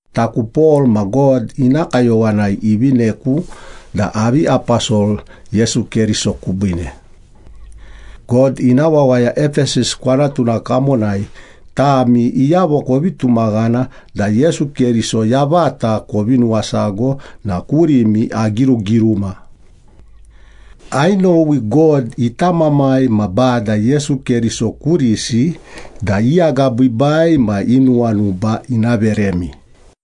Taku Pol, ma God ina kayowanai ivineku da avi aposol Yesu Keriso kubiine. God ina wawaya Epesas kwanatuna kamonai, tami iyavo kovi tumaghana da Yesu Keriso yavata kovi nuwasago na kurimi agirugiruma. Ainowi God ita Mamai ma Bada Yesu Keriso kurisi da i agabiibai ma i nuwanuba ina veremi.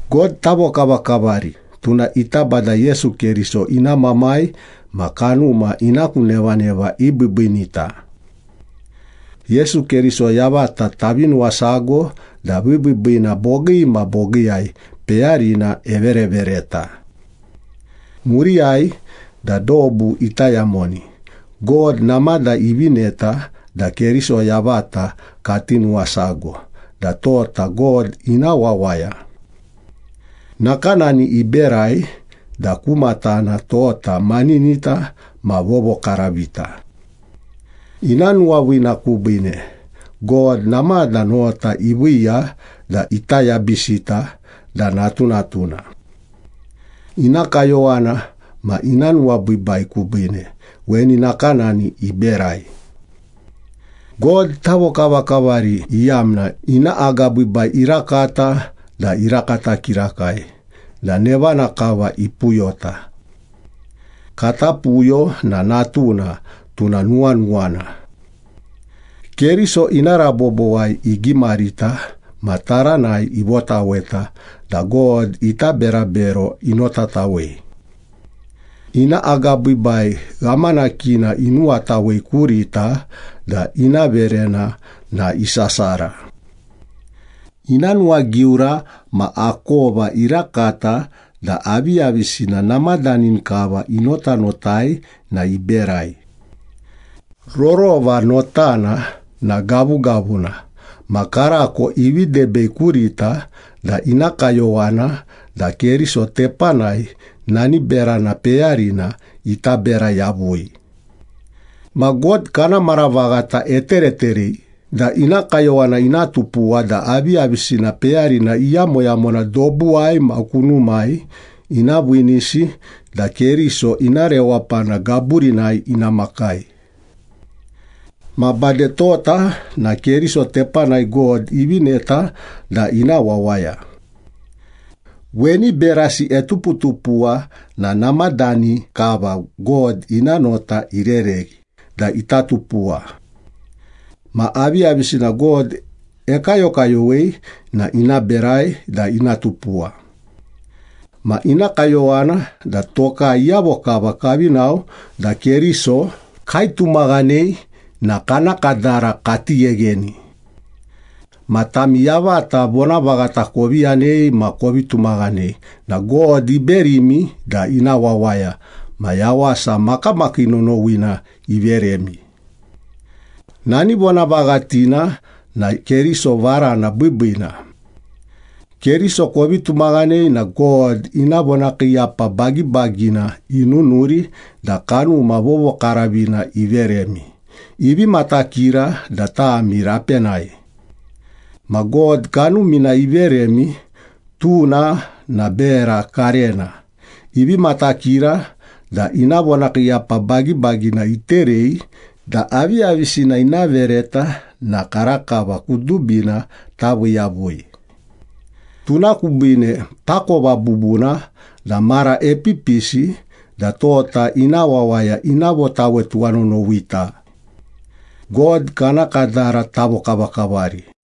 God tavokavakavari, tuna ita Bada Yesu Keriso ina Mamai ma kanuma ina ku nevaneva ibiibiinita. Yesu Keriso yavata tavi nuwasago da vibiibiina bogii ma bogiiyai peyarina everevereta. Muriyai da dobu ita yamoni, God namada ivineta da Keriso yavata kati nuwasago da tota God ina wawaya. Nakanani iberai da ku matana tota maninita ma vovokaravita. Ina nuwaviina kubiine, God namada nota iviiya da ita yabisita da natunatuna. Ina kayowana ma ina nuwabiibai kubiine weni nakanani iberai. God tavokavakavari iyamna ina agabiibai irakata da irakata kirakai, da nevana kava ipuyota. Kata puyo na Natuna, tuna nuwanuwana. Keriso ina rabobowai igimarita ma taranai ivotaweta da God ita berabero inotatawei. Ina agabiibai ghamanakina inuwatawei kurita da ina verena na isasara. Ina nuwagiura ma akova irakata da aviyavisina namadani kava inotanotai na iberai. Rorova notana na gavugavuna ma karako ivi debei kurita da ina kayowana da Keriso tepanai nani berana peyarina ita bera yavui. Ma God kana mara vaghata etereterei da ina kayowana ina tupuwa da aviyavisina peyarina iyamoyamona dobuwai ma kunumai ina viinisi da Keriso ina rewapana gaburinai ina makai. Ma bade tota na Keriso tepanai God ivineta da ina wawaya. Weni berasi etuputupuwa na namadani kava God ina nota irereghi da ita tupuwa. Ma aviyavisina God ekayokayowei na ina berai da ina tupuwa. Ma ina kayowana da tokai iyavo kava kavi nao da Keriso kaitumaghanei na kana kadara kati ghegheni. Ma tami yavata vonavaghata kovi yanei ma kovi tumaghanei na God iberimi da ina wawaya ma yawasa makamakii nonowina iveremi. Nani vonavaghatina na Keriso Varana Biibiina. Keriso kovi tumaghanei na God ina vonakiiyapa bagibagina inunuri da Kanuma Vovokaravina iveremi, ivi matakira da tami rapenai. Ma God Kanumina iveremi, tuna na bera karena, ivi matakira da ina vonakiiyapa bagibagina iterei da aviyavisina ina vereta na karakava kudubina tavii yavui. Tuna kubiine takova bubuna da mara epipisi da tota ina wawaya ina votawe tuwanonowita. God kana kadara tavokavakavari!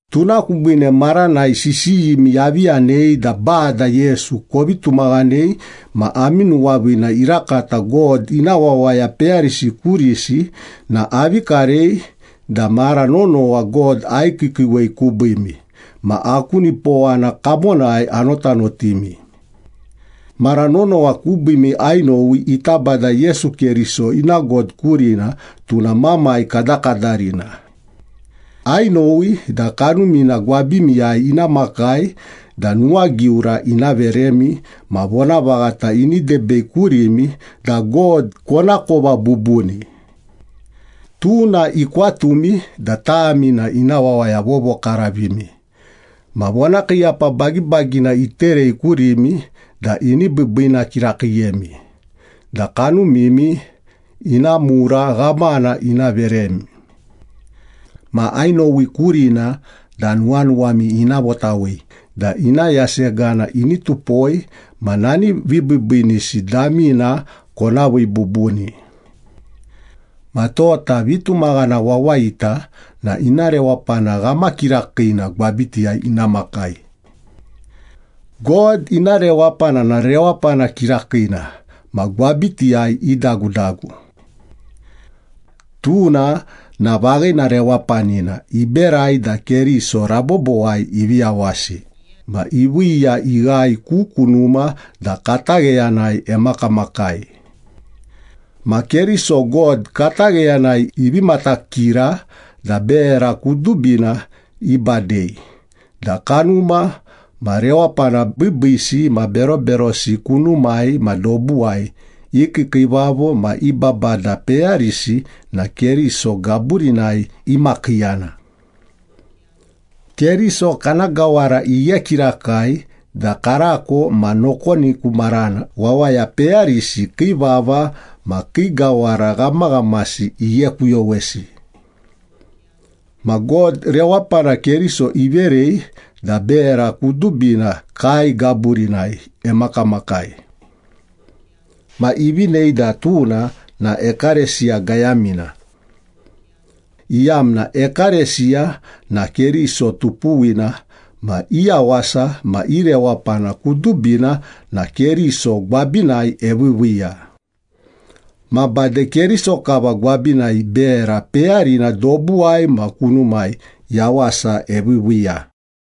Tuna kubiine maranai sisiyimi avi yanei da Bada Yesu kovi tumaghanei ma ami nuwaviina irakata God ina wawaya peyarisi kurisi na avi karei da mara nonowa God aikiikiiwei kubiimi, ma aku nipowana kamonai anotanotimi. Mara nonowa kubiimi ainowi ita Bada Yesu Keriso ina God kurina, tuna Mamai kadakadarina. Ainowi da Kanumina gwabimiyai ina makai da nuwagiura ina veremi ma vonavaghata ini debei kurimi da God konakova bubuni. Tuna ikwatumi da tami na ina wawaya vovokaravimi ma vonakiiyapa bagibagina iterei kurimi da ini biibiina kirakiiyemi da kanumimi ina mura ghamana ina veremi. Ma ainowi kurina da nuwanuwami ina votawei da ina yasegana ini tupoi ma nani vibiibiinisi damina kona vii bubuni. Ma tota vitumaghana wawayita na ina rewapana ghamakirakina gwabitiyai ina makai. God ina rewapana na rewapana kirakiina ma gwabitiyai idagudagu. Tuna na vaghina rewapanina iberai da Keriso rabobowai ivi yawasi ma iviiya ighae ku kunuma da katagheyanai emakamakai. Ma Keriso God katagheyanai ivi matakira da bera kudubina ibadei da kanuma ma rewapana biibiisi ma beroberosi kunumai ma dobuwai i kiikiivavo ma i babada peyarisi na Keriso gaburinai imakiiyana. Keriso kana gawara ighe kirakai da karako ma nokoni ku marana wawaya peyarisi kii vava ma kii gawara ghamaghamasi ighekuyowesi. Ma God rewapana Keriso iverei da bera kudubina kae gaburinai emakamakai. Ma ivinei da tuna na ekalesiya gayamina, iyamna ekalesiya na Keriso tupuwina ma i yawasa ma i rewapana kudubina na Keriso gwabinai eviiviiya. Ma bade Keriso kava gwabinai bera peyarina dobuwai ma kunumai yawasa eviiviiya.